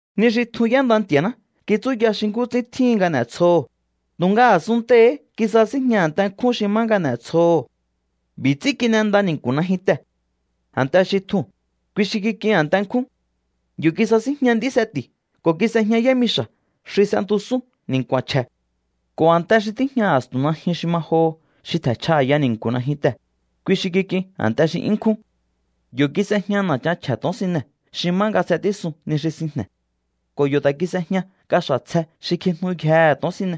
Ni xi tjun y'énda Nti̱a̱ná kitsúya xi nkú ts'ín tjíhin nga n'e̱tsjoho̱, tu̱nga a̱sunntei̱hí kisasínjña a̱nte nkjún xi má nga n'e̱tsjoho̱. B'i̱ ts'ín kin'enda ni̱nku̱ najyuntee̱. A̱nte xi tjuu̱n, kui xi kik'in a̱nte nkjún. Yo̱ kisasínjña nd'í seti̱u̱ ko̱ kis'ejña yámixa̱ xi s'entusún ni̱nku̱a̱n chje̱. Ko̱ a̱nte xi tíjña a̱stu̱n najyun xi ma joho xi tje̱nchja a̱ya ni̱nku̱ najyuntee̱, kui xi kik'in a̱nte xi 'yún nkjún. Yo̱ kis'ejña na̱chan chje̱ to̱onsine xi má nga s'etísun ni xi sinjne̱. Ko̱ yo̱ ta̱ kis'ejña kaxa̱ tsje xi kjijnuyjehe̱ to̱onsine.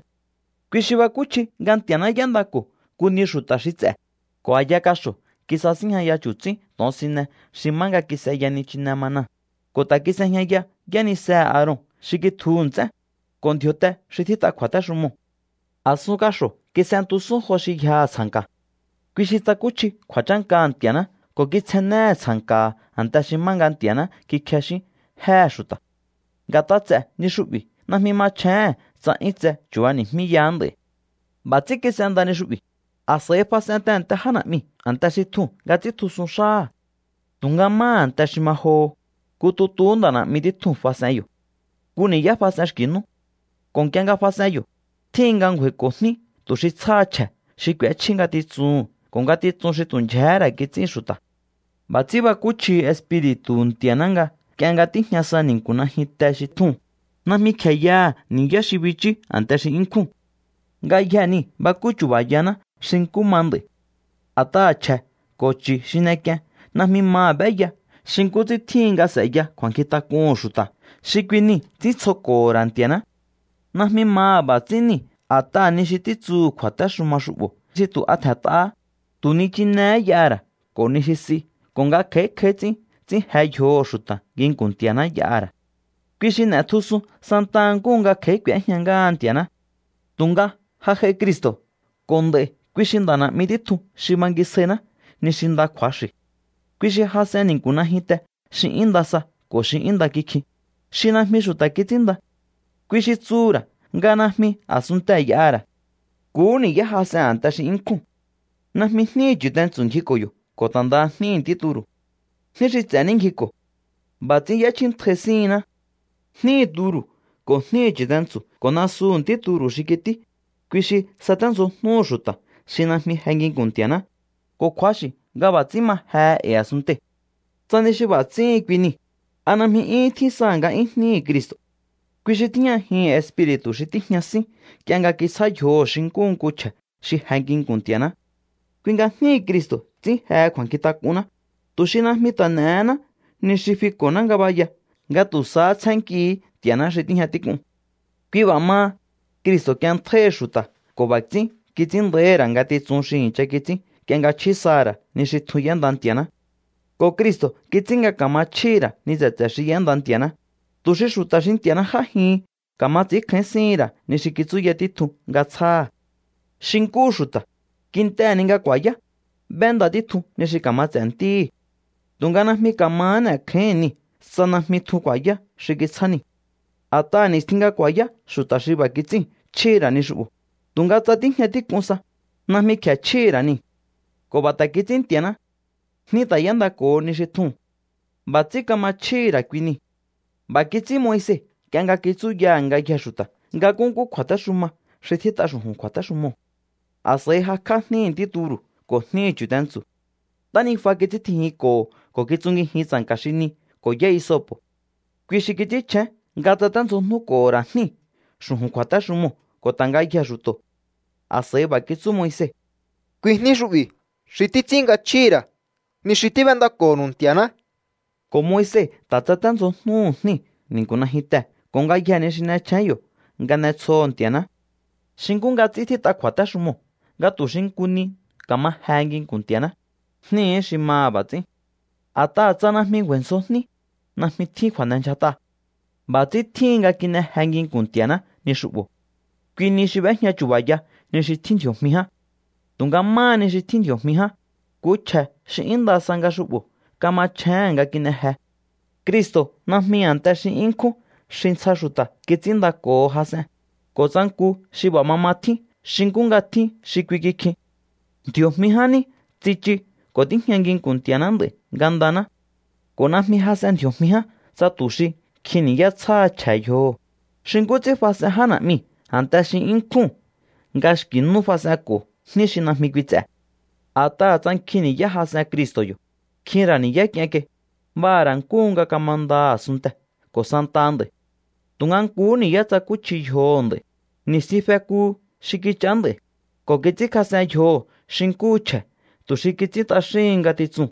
Kui xi bakúchji nga Nti̱a̱ná y'éndako̱ nku ni xu̱ta̱ xi ts'e̱, ko̱ a̱ya kaxo̱ kisasínjñaya chu̱tsín to̱onsine xi má nga kis'eya nichine manaa̱, ko̱ ta̱ kis'ejñaya yánisehe̱ Aaron xi kitjuhu̱ nts'én, ko̱ ndji̱o̱te xi tjít'a kju̱a̱téxumoo̱. A̱sun kaxo̱ kis'entusún jo xi yjaha̱ tsja̱nka. Kui xi tsakúchji kju̱a̱chánkaha̱ Nti̱a̱ná ko̱ kitsjennéhe̱ tsja̱nka̱ha̱ a̱nte xi má nga Nti̱a̱ná kikjexín jéhe̱ xu̱ta̱. Nga̱t'a ts'e̱ ni xu'bi̱ najmi machjéhe̱n tsa 'yún tse chu̱bani̱jmíyaá nd'a̱i̱. B'a̱ ts'ín kis'enda ni xu'bi̱, a̱s'a̱i fas'en tehe̱nte já na̱'miu̱ a̱nte xi tjuu̱n nga ts'íntjusun xáha̱. Tu̱nga máha a̱nte xi ma joho, nku tutuhú nda̱ na̱'mi títjuu̱n fas'en yo̱. Nku ni̱yá fas'en xki̱ nú. Ko̱ nk'ie nga fas'en yo̱, tjíhin nga ngju̱a̱i̱ko̱ jní tu̱ xi tsjáha chje̱ xi k'úéchjí ngatitsuhu̱n ko̱ ngatitsun xi tu̱ ndyjehé ra̱ kits'ín xu̱ta̱. B'a̱ ts'ín bakúchjihi Espiri̱tu̱hu̱ Nti̱a̱ná nga nk'ie nga tíjña sa ni̱nku̱ najyunte xi tjuu̱n, najmi kje̱e yaha̱ ni̱yá xi bichú a̱nte xi 'yún nkjúu̱n. Ngayjee̱ niu̱ bakú chu̱ba̱yaná xi nkú ma nd'a̱i̱. A̱t'aha̱ chje̱ ko̱ chu̱ xi n'ek'ien najmi maha̱ b'éya xi nkú ts'ín tjíhin nga s'e̱ya kju̱a̱nkjintak'uhu̱n xu̱ta̱ xi kui nii̱ ts'íntsjoko̱ho̱ ra̱ Nti̱a̱ná. Najmi maha̱ b'a̱ ts'ín niu̱ a̱t'aha̱ ni xi títsuhú kju̱a̱téxuma xu'bo̱ xi tu̱ a tje̱nt'ahá, tu̱ ni chinehé y'aha̱ ra̱ ko̱ ni xi s'i ko̱ nga kj'a̱í kj'a̱í ts'ín ts'ín je yjoho̱ xu̱ta̱ nginku̱n Nti̱a̱ná y'aha̱ ra̱. Kui xi n'e̱tjusun santa nkúhu nga kj'a̱í k'u̱éjña ngáha Nti̱a̱ná. Tu̱nga ja j'ai Cristo̱ ko̱ nd'a̱i̱ kui xi nda̱ na̱'mi títjun xi bangisjainá ni xi nda kju̱axi̱. Kui xi jas'en ni̱nku̱ najyunte xi 'yún nda sa ko̱ xi nda kikjin, xi najmi xu̱ta̱ kits'ínnda. Kui xi tsuhu̱ ra̱ nga najmi a̱sunntee̱ y'aha̱ ra̱. Nkuhú ni̱yá jas'en a̱nte xi 'yún nkjúu̱n. Najmi jníhi̱ chu̱tentsu̱ ngjiko̱ yo̱ ko̱ ta̱ ndaha jníhi̱ ntí turu̱. Jní xi ts'e̱ ní ngjiko̱. B'a̱ ts'ín y'échjíntjai síhinná. Jníhi̱ turu̱ ko̱ jníhi̱ chu̱tentsu̱ ko̱ nasuhu̱ ntí turu̱ xi kití, kui xi saténdzjojnúhu̱ xu̱ta̱ xi najmi je nginku̱n Nti̱a̱ná, ko̱ kju̱axi̱ nga b'a̱ ts'ín ma jehe e̱i̱ a̱sunntei̱. Tsa ni xi b'a̱ ts'íhin kui niu̱, ¿a najmi 'yúhún tjín saha̱ nga'yún jníhi̱ Cristo̱? Kui xi tíjñajihi̱n Espiri̱tu̱ xi tíjña sín nk'ie nga kitsjá yjoho̱ xi nkúhu nku chje̱ xi je nginku̱n Nti̱a̱ná. Kui nga jníhi̱ Cristo̱ ts'ín jehe kju̱a̱nkjintak'unná, tu̱ xi najmi ta̱ n'e̱hená ni xi fiko̱ná ngabaya nga tu̱ sahá tsjénnkihi̱í Nti̱a̱ná xi tíjña tík'un. Kui b'a̱ maha, Cristo̱ k'ienntjáíhi xu̱ta̱ ko̱ b'a̱ ts'ín kits'ín nda̱íhi̱ ra̱ ngatitsun xi i̱ncha kits'ín nk'ie nga chjí saha̱ ra̱ ni xi tjun y'énda Nti̱a̱ná. Ko̱ Cristo̱ kits'ín nga kama chjíhi̱ ra̱ ni tse̱tse̱ xi y'énda Nti̱a̱ná, tu̱ xi xu̱ta̱ xi Nti̱a̱ná j'ájihin ka̱ma ts'i̱ínkjáín síhi̱n ra̱ ni xi kitsúya títjun nga tsjáha̱. Xi nkúhu xu̱ta̱, kintehe̱ ni nga ku̱a̱yá, b'énda títjun ni xi ka̱ma ts'e̱ ntíhi̱. Tu̱nga najmi ka̱mahá n'e̱kjáíhi̱n niu̱ tsa najmi tjun ku̱a̱yá xi kitsjá niu̱. A̱t'aha̱ ni̱stjin nga ku̱a̱yá xu̱ta̱ xi b'a̱ kits'íu̱n chjíhi̱ ra̱ ni xu'bo̱, tu̱nga tsa tíjña tík'un sa, najmi kje̱e chjíhi̱ ra̱ niu̱. Ko̱ b'a̱ ta̱ kits'ín Nti̱a̱ná. Jní ta̱ y'éndako̱ho ni xi tjuu̱n. B'a̱ ts'ín kama chjíhi̱ ra̱ kui nii̱. B'a̱ kits'ín Moise nk'ie nga kitsúyaha̱ ngayjee̱ xu̱ta̱ nga nkúnkú kju̱a̱téxuma xi tjít'a xu̱ju̱n kju̱a̱téxumoo̱. A̱s'a̱i jakj'á jníhi̱ ntí turu̱ ko̱ jníhi̱ chu̱tentsu̱. Ntánijua kits'íntjijinko̱ho ko̱ kitsungijin tsa̱nka̱ xi ni ko̱ yá isopo̱. Kui xi kits'ínchjén nga tsaténdzjojnúko̱ho̱ ra̱ jníu̱ xu̱ju̱n kju̱a̱téxumoo̱ ko̱ ta̱ ngayjee̱ xu̱to̱. A̱s'a̱i b'a̱ kitsú Moise: “Kui jní xu'bi̱ xi títs'ín nga chjíhi̱ ra̱ ni xi tíb'éndako̱nu̱u Nti̱a̱ná.” Ko̱ Moise ta̱ tsaténdzjojnuhu̱ jníu̱ ni̱nku̱ najyuntee̱ ko̱ ngayjee̱ ni xi n'echjén yo̱ nga n'etsjoho̱ Nti̱a̱ná. Xi nkú nga ts'ín tjít'a kju̱a̱téxumoo̱ nga tu̱ xi nku ni ka̱ma jehe nginku̱n Nti̱a̱ná, jníhí xi maha̱ b'a̱ ts'ín. A̱t'aha̱ tsa najmi ngju̱a̱i̱ ndzjo jní, najmi tjín kju̱a̱n'endyjat'a. B'a̱ ts'ín tjíhin nga kin'e je nginku̱n Nti̱a̱ná ni xu'bo̱. Kui niu̱ xi b'éjña chu̱ba̱ya ni xi tjín ndji̱o̱jmi ján. Tu̱nga máha ni xi tjín ndji̱o̱jmi ján, nku chje̱ xi 'yún nda sa nga xu'bo̱ kamachjéhe̱n nga kin'e je. Cristo̱ najmi a̱nte xi 'yún nkjún xi ntsja xu̱ta̱ kits'ínndako̱ho jas'en, ko̱ tsa nku xi b'a̱ mama tjín xi nkú nga tjín xi kui kikjin. Ndji̱o̱jmi ján ní tsichu ko̱ tíjña nginku̱n Nti̱a̱ná nd'a̱i̱ ngandaná. Ko̱ najmi jas'en ndji̱o̱jmi ján tsa tu̱ xi nkjin ni̱yá tsjáha chje̱ yjoho̱, xi nkú ts'ín fas'en já na̱'miu̱ a̱nte xi 'yún nkjúu̱n nga xki̱ nú fas'enko̱ jní xi najmi kui ts'e̱. A̱t'aha̱ tsa nkjin ni̱yá jas'en Cristo̱ yo̱, nkjin ra̱ ni̱yá k'ien kai, b'aha̱ ra̱ nkúhu nga kamanda a̱sunntee̱ ko̱ santaha nd'a̱i̱. Tu̱nga nkuhú ni̱yá tsakúchji yjoho̱ nd'a̱i̱, ni̱stjin fekuhu xi kich'aá nd'a̱i̱, ko̱ kits'ínkjas'en yjoho̱ xi nkúhu chje̱ tu̱ xi kits'ín t'axíhin ngatitsuu̱n.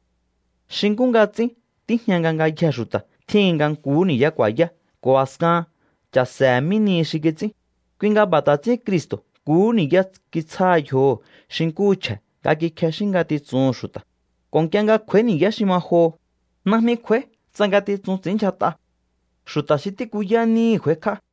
Xi nkú nga ts'ín tíjña nga ngayjee̱ xu̱ta̱ tjíhin nga nkuhú ni̱yá ku̱a̱yá ko̱ a̱skahan cha̱se̱he̱ mí nihi xi kits'ín, kui nga b'a̱ ta̱ ts'ín Cristo̱ nkuhú ni̱yá kitsjá yjoho̱ xi nkúhu chje̱ nga kikjexín ngatitsuhu̱n xu̱ta̱. Ko̱ nk'ie nga kj'u̱a̱í ni̱yá xi ma joho, najmi kj'u̱a̱í tsa ngatitsun ts'i̱ínndyjat'a. Xu̱ta̱ xi tíkuyá níhi̱ kj'u̱a̱íkj'á.